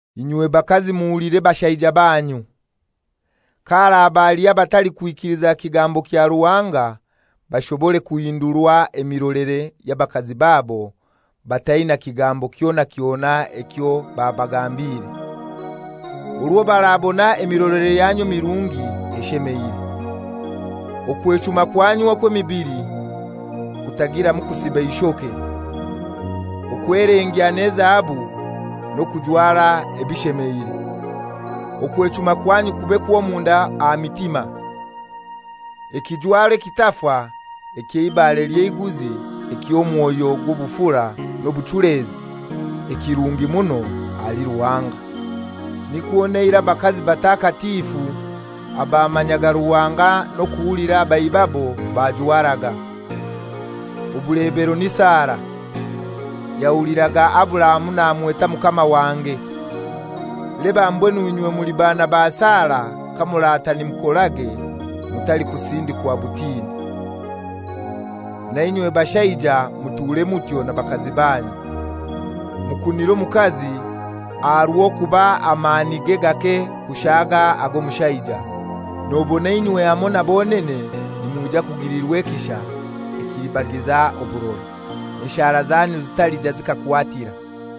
Inywe bakazi muhulire bashaija banyu. Ka haraba haliho abatalikwikiliza kigambo kya Ruhanga, bashobore kuhindurwa emirolere ya bakazi babo bataina kigambo kyona kyona ekyo babagambire, orwo barabona emirolere yanyu emirungi eshemeire. Okwechuma kwanyu okw'emibili kutagiramu kusiba ishoke, okwelengya n'ezahabu n'okujwara ebishemeire. Okwechuma kwanyu kube kw'omunda aha mitima, ekijwaro ekitafa eky'eibare ly'eiguzi eky'omwoyo gw'obufura n'obuchulezi, ekirungi muno ahali Ruhanga. Nikwo n'eirai abakazi batakatifu abamanyaga Ruhanga n'okuhulira baibabo bajwaraga. Obulebero ni Sara; yahuliraga Aburahamu namweta «Mukama wange.» Leba mbwenu inywe muli baana ba Sara kamurata nimukorage mutalikusindikwa butini. Nainywe bashaija muture mutyo na bakazi banyu. Mukunire omukazi aha rw'okuba amanige gake kushaaga ag'omushaija, nobona inywe hamoi na bonene nimwija kugilirwa ekisha ekilibagiza oburora, enshara zanyu zitaliija zikakwatira.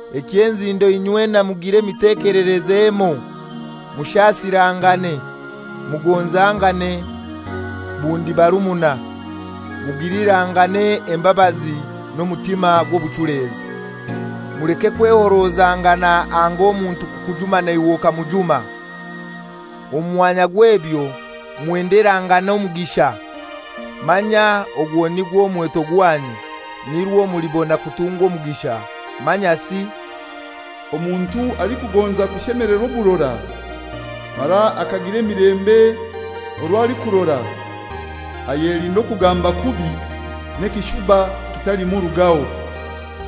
Eky'enzindo inywena mugire emitekelereze emoi, mushasirangane, mugonzangane bundi barumuna, mugilirangane embabazi n'omutima gw'obuchulezi. Muleke kwehorozangana anga omuntu kukujuma naiwe okamujuma. Omu mwanya gw'ebyo mwenderangane omugisha, manya ogwo nigwo mweto gwanyu, nirwo mulibona kutungwa omugisha. Manyasi, «Omuntu alikugonza kushemelerwa oburora, mara akagira emilembe orwo alikurora, ayelinde okugamba kubi, n'ekishuba kitalimurugaho.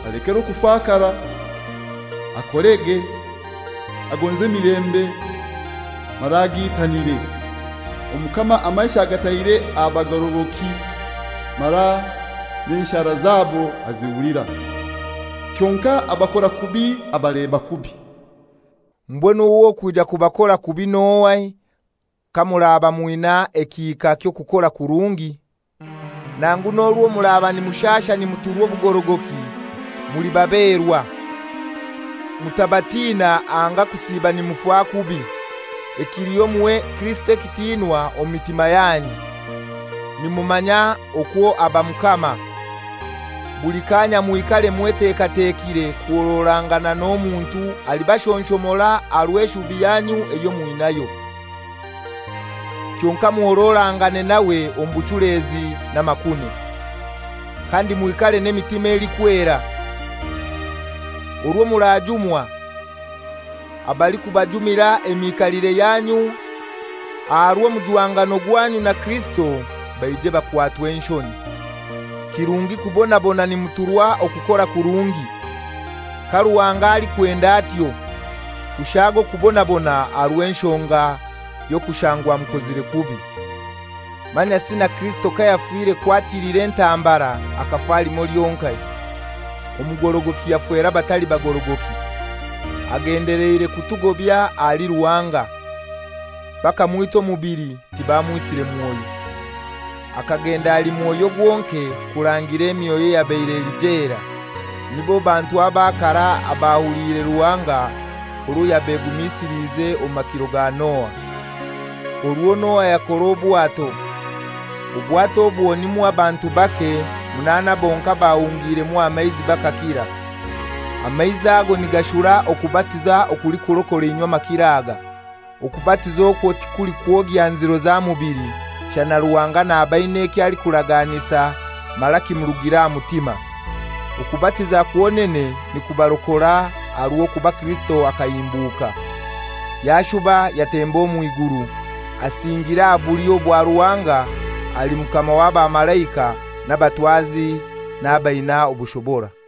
Alekere okufakara, akorege, agonze emilembe mara agiitanire. Omukama amaisho agataire aha bagorogoki, mara n'enshara zabo azihulira. Kyonkai abakora kubi abaleba kubi.» Mbwenu ow'okwija kubakora kubi n'ohai kamuraba mwina ekihika ky'okukora kurungi? Nangu n'orwo muraba nimushasha nimuturwa obugorogoki, muli baberwa. Mutabatina anga kusiiba nimufa kubi. Ekiliho muhe Kirisito ekitiinwa omu mitima yanyu, nimumanya okwo aba Mukama. Buli kaanya mwikare mwetekatekire kuhororangana n'omuntu alibashonshomora aha rw'eshubi yanyu eyo mwinayo. Kyonkai muhororangane nawe omu buchulezi n'amakune. Kandi mwikare n'emitima elikwera, orwo murajumwa, abalikubajumira emikaliire yanyu aha rw'omujwangano gwanyu na Kirisito baije bakwatwe enshoni. Kirungi kubonabona nimuturwa okukora kurungi, ka Ruhanga alikwenda atyo, kushaaga okubonabona aha rw'enshonga y'okushangwa mukozire kubi. Manyasi na Kirisito kayafire kwatilira entambara akafa limoi lyonkai, omugorogoki yafera abatali bagorogoki, agendeleire kutugobya ahali Ruhanga. Bakamwita omubili, tibamwisire mwoyo. Akagenda ali mwoyo gwonaka kurangira emyoyo eyabaire eli jela, nibo bantu aba karai abatahuliire Ruhanga orwo yabegumisiliize omu makiro ga Noa, orwo Noa yakora obwato. Obwato obwo nimwo abantu bake, munaana bonkai, bahungiiremu aha maizi bakakira, amaizi ago nigashura okubatiza okulikurokora inywe makiro aga. Okubatiza okwo tikulikwogya nziro za mubili, shana Ruhanga naba aina ekyo alikubaraganisa mara kimurugire aha mutima. Okubatiza kwonene nikubarokora aha rw'okuba Kirisito akahimbuka, yashuba yatemba omw'iguru, asingiire aha bulyo bwa Ruhanga, ali Mukama w'abamalaika, n'abatwazi n'abaina obushobora.